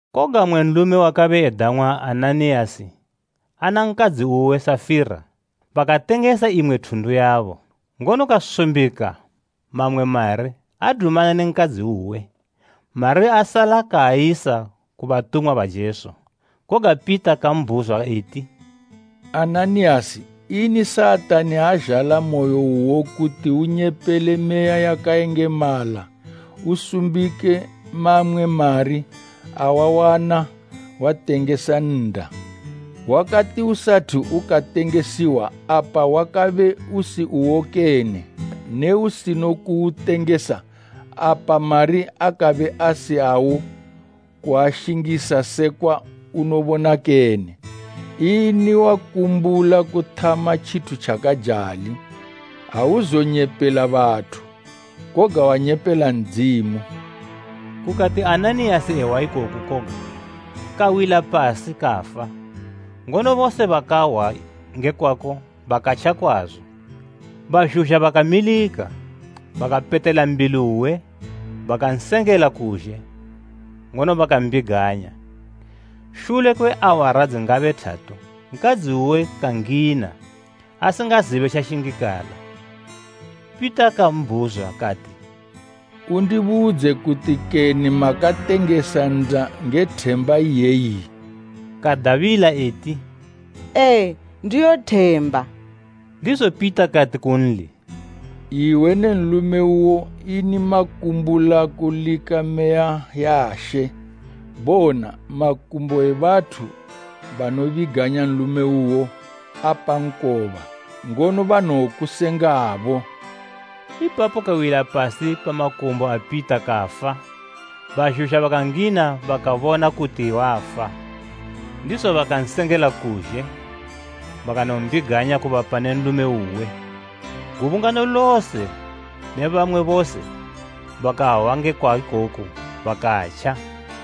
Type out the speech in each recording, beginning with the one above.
Koga mmwe nlume wakabe edang'wa Ananiyasi ana nkadzi uwe Safira, bakatengesa imwe thundu yabo. Ngono kasumbika mamwe mari adumana ne nkadzi uwe, mari asala kaayisa ku batumwa ba Jesu. Koga Pita kambhuzwa eti, “Ananiyasi, ini Satani azhala moyo uwo kuti unyepele Meya yakayengemala usumbike mamwe mari awawana watengesa nnda? Wakati usathu ukatengesiwa apa wakabe usi uwo kene? Ne usinokuwutengesa, apa mari akabe asi awo kuashingisa sekwa unobona kene? Ini wakumbula kuthama tjithu tjakajali? Auzonyepela bathu, koga wanyepela Ndzimu!” Kukati Ananiyasi ehwa ikoku koga, kawila pasi kafa; ngono bose bakahwa nge kwako bakatja kwazo. Bazhuzha bakamilika, bakapetela mbili uwe, bakansengela kuzhe, ngono bakambiganya. Shule kwe awara dzingabe thatu nkadzi uwe kangina, asingazibe tjashingikala. Pita kambhuzwa kati, “Undibudze, kuti kene makatengesa nnda nge themba iyeyi?” Kadabila eti, “Ee, ndiyo themba.” Ndizo Pita kati kunli, “Iwe ne nlume uwo ini makumbula kulika Meya ya She? Bona, makumbo e bathu banobiganya nlume uwo apa nkoba, ngono banowokusengabo!” Ipapo kawila pasi pa makumbo a Pita kafa. Bazhuzha bakangina bakabona kuti wafa, ndizo bakansengela kuzhe bakanombiganya kubapa ne nlume uwe. Gubungano lose ne bamwe bose bakahwa ngekwa ikoku bakatja.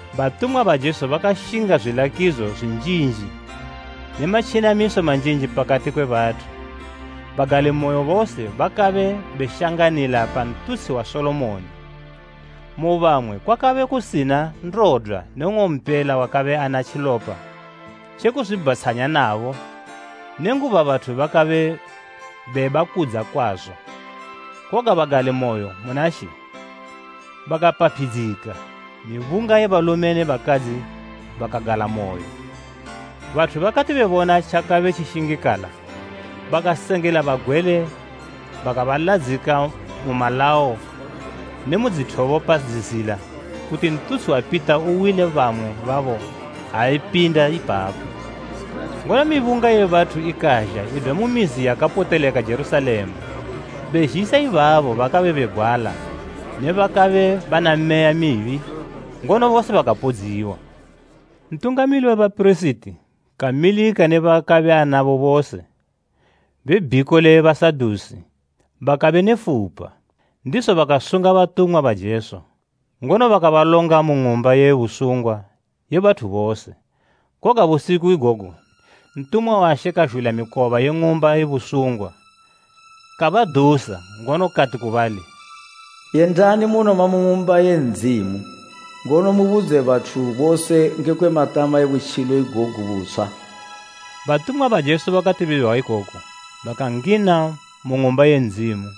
Batumwa ba Jesu bakashinga zwilakidzo zwinjinji ne matjenamiso manjinji pakati kwe bathu. Bagalimoyo bose bakabe beshanganila pa ntutshi wa Solomoni. Mu bamwe kwakabe kusina ndodwa ne nng'ompela wakabe ana tjilopa tje kuzwibhatshanya nabo nenguba bathu bakabe bebakudza kwazo. Koga bagalimoyo muna She bakapaphidzika, mibunga ye balume ne bakadzi bakagalamoyo. Bathu bakati bebona tjakabe tjishingikala bakasenga bagwele bakabaladzika mu malawo nemu dzithobo pa dzizila kuti ntutshi wa Pita uwile bamwe babo ha epinda ipapo. Ngono mibunga ye bathu ikazha idwa mu mizi yakapoteleka Jerusalema, bezhisa ibabo bakabe begwala ne bakabe bana meya mibi; ngono bose bakapodziwa. Ntungamili we bapirisiti kamilika ne baakabe anabo bose, be bhiko le Basadusi, bakabe ne fupa, ndizo bakasunga batumwa ba Jesu, ngono bakabalonga mu ng'umba ye busungwa ye bathu bose. Koga busiku igogo ntumwa wa She kazhula mikoba ye ng'umba ye busungwa, kabadusa, ngono kati ku bali, “Yendani munoma mu Ng'umba ye Ndzimu, ngono mubudze bathu bose ngekwe matama e butjilo igogu butshwa.” Batumwa ba Jesu bakati behwa ikoku bakangina mu Ng'umba ye Ndzimu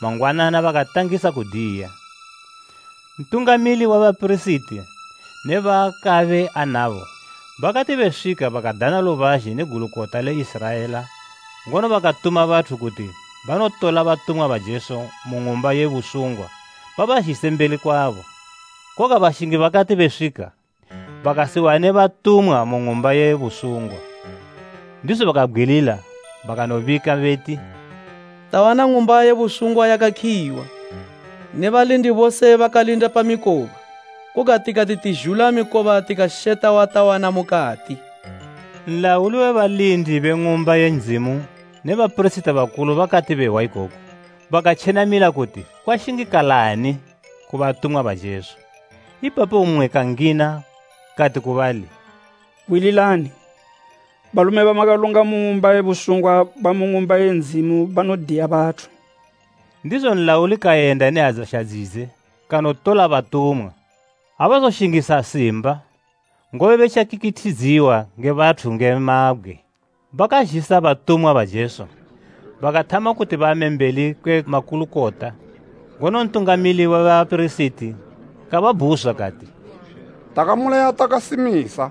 mangwanana bakatangisa kudiya. Ntungamili we bapirisiti ne baakabe anabo bakati beswika bakadana lubazhe ne Gulukota le Iziraela ngono bakatuma bathu kuti banotola batumwa ba Jesu mu ng'umba ye busungwa babazhise mbeli kwabo. Koga bashingi bakati beswika, bakasiwane batumwa mu ng'umba ye busungwa, ndizo bakabgwilila bakanobika beti, “Tawana ng'umba ye busungwa yakakhiyiwa ne balindi bose bakalinda pa mikoba; koga tikati tizhula mikoba tikasheta watawana mukati!” Nlauli we balindi be Ng'umba ye Ndzimu ne bapirisiti bakulu bakati behwa ikoku, bakatjenamila kuti kwashingikalani ku batumwa ba Jesu. Ipapo mmwe kangina kati ku bali, “Hwililani! Balume bamakalonga mu ng'umba ye busungwa bamu Ng'umba ye Ndzimu banodiya bathu!” Ndizo nlauli kayenda ne adzasha dzidze kanotola batumwa. Abazoshingisa simba, ngobe betja kikithidziwa nge bathu nge mabgwe. Bakazhisa batumwa ba Jesu, bakathama kuti bame mbeli kwe makulukota, ngono Ntungamili we bapirisiti kababhuzwa, kati, “Takamulaya takasimisa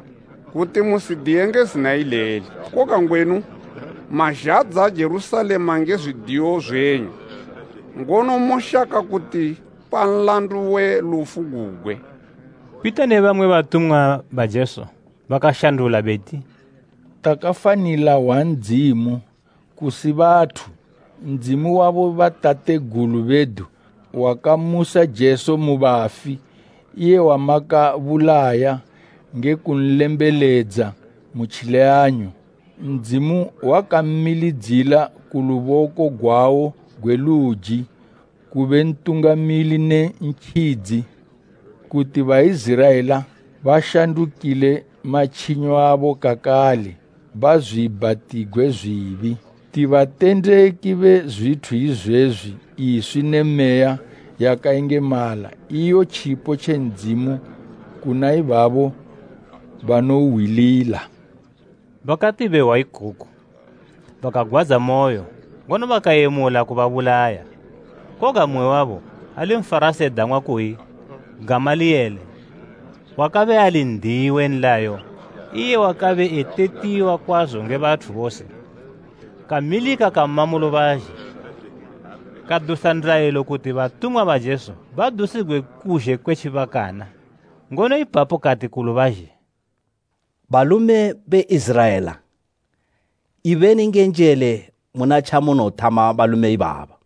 kuti musidiye nge zina ileli, koga ngwenu mazhadza Jerusalema nge zwidiyo zwenyu, ngono moshaka kutipa nlandu we lufu gugwe!” Pita ne bamwe batumwa ba Jesu bakashandula beti, “Takafanila hwa Ndzimu, kusi bathu. Ndzimu wa bobatategulu bedu wakamusa Jesu mu bafi, iye wamakabulaya nge kunlembeledza mu tjileyanyo. Ndzimu wakammilidzila ku luboko gwawo gwe luji kube Ntungamili ne Ntjidzi, kuti Baiziraela bashandukile matjinyo abo kakale bazwiibhatigwe zwibi. Ti batendeki be zwithu izwezwi, iswi ne Meya yakayengemala, iyo tjipo tje Ndzimu kuna ibabo banouhwilila.” Bakati behwa ikoku, bakagwadzamoyo, ngono bakayemula kubabulaya. Koga mmwe wabo, ali Nfarasi edang'wa kuyi Gamaliyele, wakabe ali n'diyi we nlayo, iye wakabe etetiwa kwazo nge bathu bose, kamilika kama mu lubazhe. Kadusa ndayilo kuti batumwa ba Jesu badusigwe kuzhe kwe tjibakana, ngono ipapo kati ku lubazhe, “Balume be Iziraela, ibeni nge njele muna tjamunothama balume ibaba.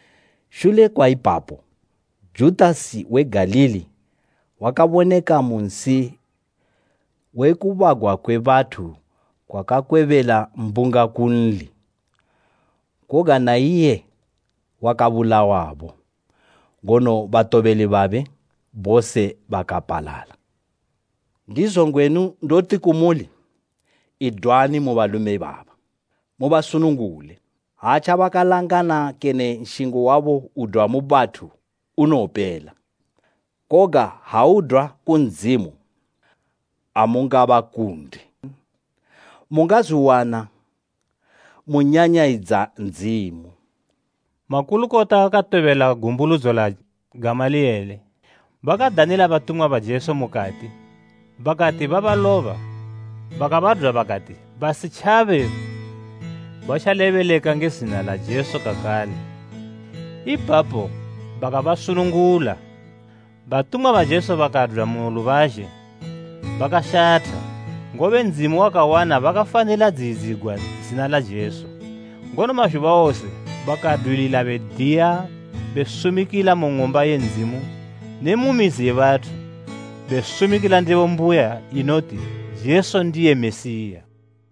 Shule kwa ipapo, Judasi we Galili wakaboneka mu nsi we kubagwa kwe bathu kakwebela mbunga kunli, koga na iye wakabulawabo ngono batobeli babe bose bakapalala. Ndizo ngwenu ndoti kumuli, idwani mu balume ibaba. Mubasunungule! Ha tjabakalangana kene nshingo wabo udwa mu bathu unowopela, koga ha udwa ku Ndzimu, amungabakunde. Mungazwiwana munyanyayidza Ndzimu!” Makulukota katobela gumbuludzo la Gamaliyele. Bakadanila batumwa ba Jesu mukati, bakati babaloba bakabadwa bakati basitjabe batjalebeleka nge zina la Jesu kakale, ipapo bakabasunungula. Batumwa ba Jesu bakadwa mu lubazhe bakashatha, ngobe Ndzimu wakawana bakafanila dziyidzigwa zina la Jesu. Ngono mazhuba wose bakadwilila bediya be sumikila mu Ng'umba ye Ndzimu ne mu mizi ye bathu, besumikila ndebo mbuya inoti Jesu ndiye Mesiya.